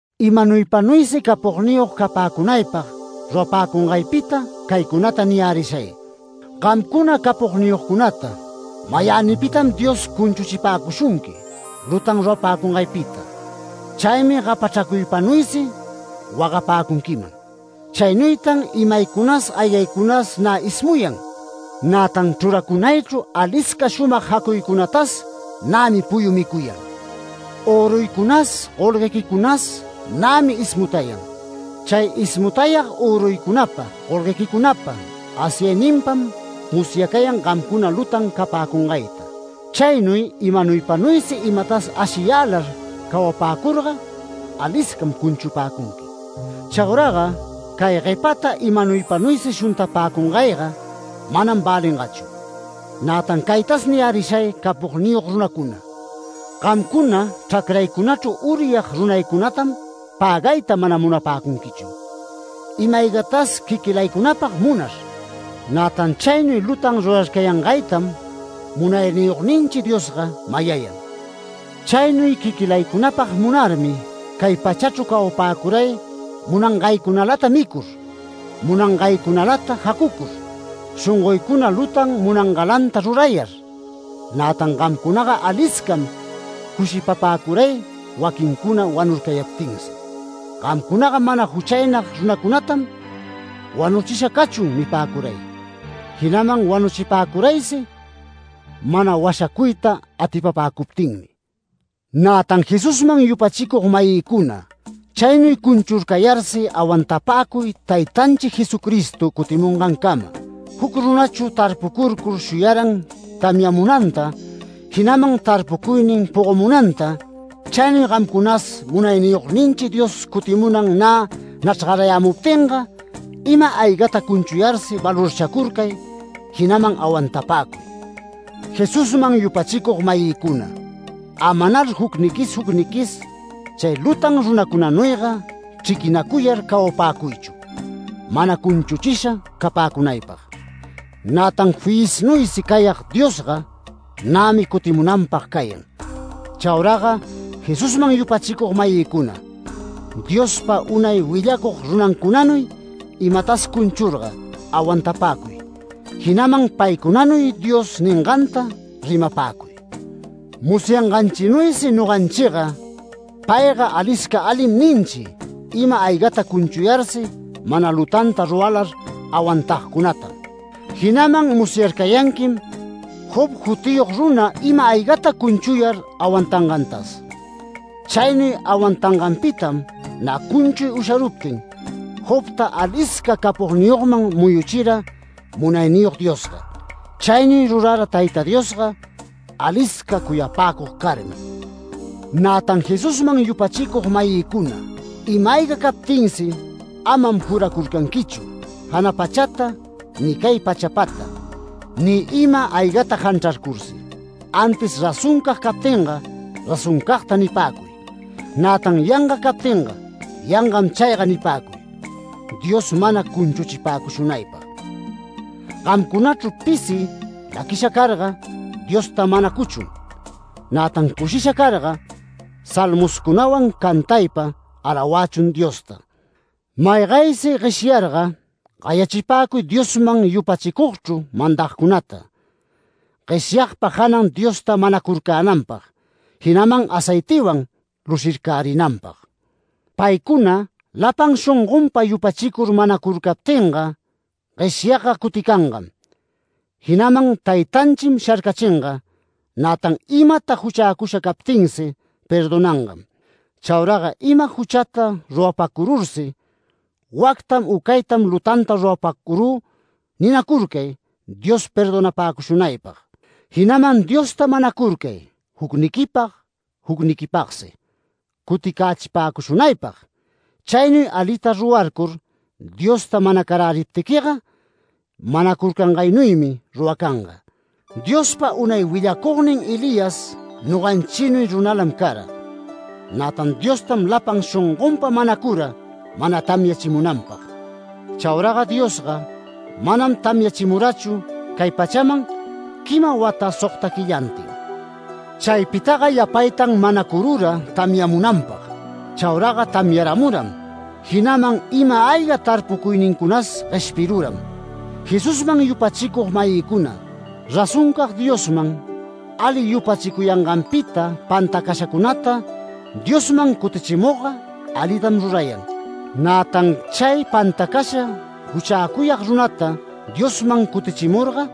Imanuypanuysi capogniyog capäcunaypag rurapäcungaypita caycunata niyärishay: Gamcuna capogniyogcunata mayänipitam Dios cunchuchipäcushunqui lutan rurapäcungaypita. Chaymi gapachracuypanuysi wagapäcunquiman. Chaynuytan imaycunas aygaycunas nä ismuyan. Nätan chruracunaychru alisca shumag jacuycunatas nämi puyu micuyan. Öruycunas golguequicunas nämi ismutayan. Chay ismutayag öruycunapa golguequicunapa asyayninpam musyacayan gamcuna lutan capäcungayta. Chaynuy imanuypanuysi imatas ashiyälar cawapäcurga aliscam cunchupäcunqui. Chauraga cay guepata imanuypanuysi shuntapäcungayga manam välingachu. Nätan caytas niyärishay capogniyog runacuna: Gamcuna chracraycunachru uryag runaycunatam pägayta mana munapäcunquichu, ima-aygatas quiquilaycunapag munar. Nätan chaynuy lutan rurarcayangaytam Munayniyogninchi Diosga mayayan. Chaynuy quiquilaycunapag munarmi cay pachachru cawapäcuray munangaycunalata micur, munangaycunalata jacucur, shongoycuna lutan munangalanta rurayar. Nätan gamcunaga aliscam cushipapäcuray waquincuna wanurcayaptinsi. Gamcunaga mana juchaynag runacunatam “Wanuchisha cachun” nipäcuray, jinaman wanuchipäcuraysi mana washacuyta atipapäcuptinmi. Nätan Jesusman yupachicug-mayïcuna, chaynuy cunchurcayarsi awantapäcuy taytanchi Jesucristo cutimungancama. Juc runachu tarpucurcur shuyaran tamyamunanta, jinaman tarpucuynin pogomunanta. Chaynuy gamcunas Munayniyogninchi Dios cutimunan nä nachrgarayämuptinga ima-aygata cunchuyarsi valorchacurcay, jinaman awantapäcuy. Jesusman yupachicug-mayïcuna, amanar jucniquis jucniquis chay lutan runacunanuyga chriquinacuyar cawapäcuychu, mana cunchuchisha capäcunaypag. Nätan fiyisnuysi cayag Diosga nämi cutimunanpag cayan. Chauraga Jesusman yupachicug-mayïcuna, Diospa unay willacug runancunanuy imatas cunchurga awantapäcuy, jinaman paycunanuy Dios ninganta rimapäcuy. Musyanganchinuysi noganchiga “Payga alisca alim” ninchi, ima-aygata cunchuyarsi mana lutanta ruralar awantagcunatam. Jinaman musyarcayanquim Job jutiyog runa ima-aygata cunchuyar awantangantas. Chaynuy awantanganpitam nä cunchuy usharuptin, Jobta alisca capogniyogman muyuchira Munayniyog Diosga. Chaynuy rurara Tayta Diosga alisca cuyapäcug carmi. Nätan Jesusman yupachicug-mayïcuna, ima-ayga captinsi amam juracurcanquichu, jana pachata, ni cay pachapata, ni ima-aygata janchrarcursi. Antis razoncag captinga “Razoncagta” nipäcuy, nätan yanga captinga “Yangam chayga” nipäcuy, Dios mana cunchuchipäcushunaypag. Gamcunachru pisi laquisha carga, Diosta manacuchun. Nätan cushisha carga, salmoscunawan cantaypa alawächun Diosta. Maygaysi gueshyarga, gayachipäcuy Diosman yupachicugchru mandagcunata, gueshyagpa janan Diosta manacurcänanpag, jinaman aceitiwan lushircärinanpag. Paycuna lapan shongonpa yupachicur manacurcaptinga, gueshyagga cuticangam, jinaman Taytanchim sharcachinga, nätan imata juchäcusha captinsi perdonangam. Chauraga ima juchata rurapacurursi, “Wactam u caytam lutanta rurapacurü” ninacurcay Dios perdonapäcushunaypag, jinaman Diosta manacurcay jucniquipag jucniquipagsi cuticächipäcushunaypag. Chaynuy alita rurarcur Diosta manacaräriptiquiga, manacurcangaynuymi ruracanga. Diospa unay willacugnin Elías noganchinuy runalam cara. Nätan Diostam lapan shongonpa manacura mana tamyachimunanpag. Chauraga Diosga manam tamyachimurachu cay pachaman quima wata sogta quillantin. Chaypitaga yapaytan manacurura tamyamunanpag. Chauraga tamyaramuram, jinaman ima-ayga tarpucuynincunas gueshpiruram. Jesusman yupachicug-mayïcuna, razoncag Diosman ali yupachicuyanganpita pantacashacunata Diosman cutichimugga alitam rurayan. Nätan chay pantacasha juchäcuyag runata Diosman cutichimurga,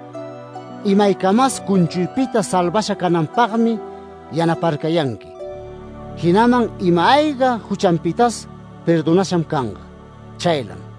imaycamas cunchuypita salvasha cananpagmi yanaparcayanqui, jinaman ima-ayga juchanpitas perdonasham canga. Chaylam.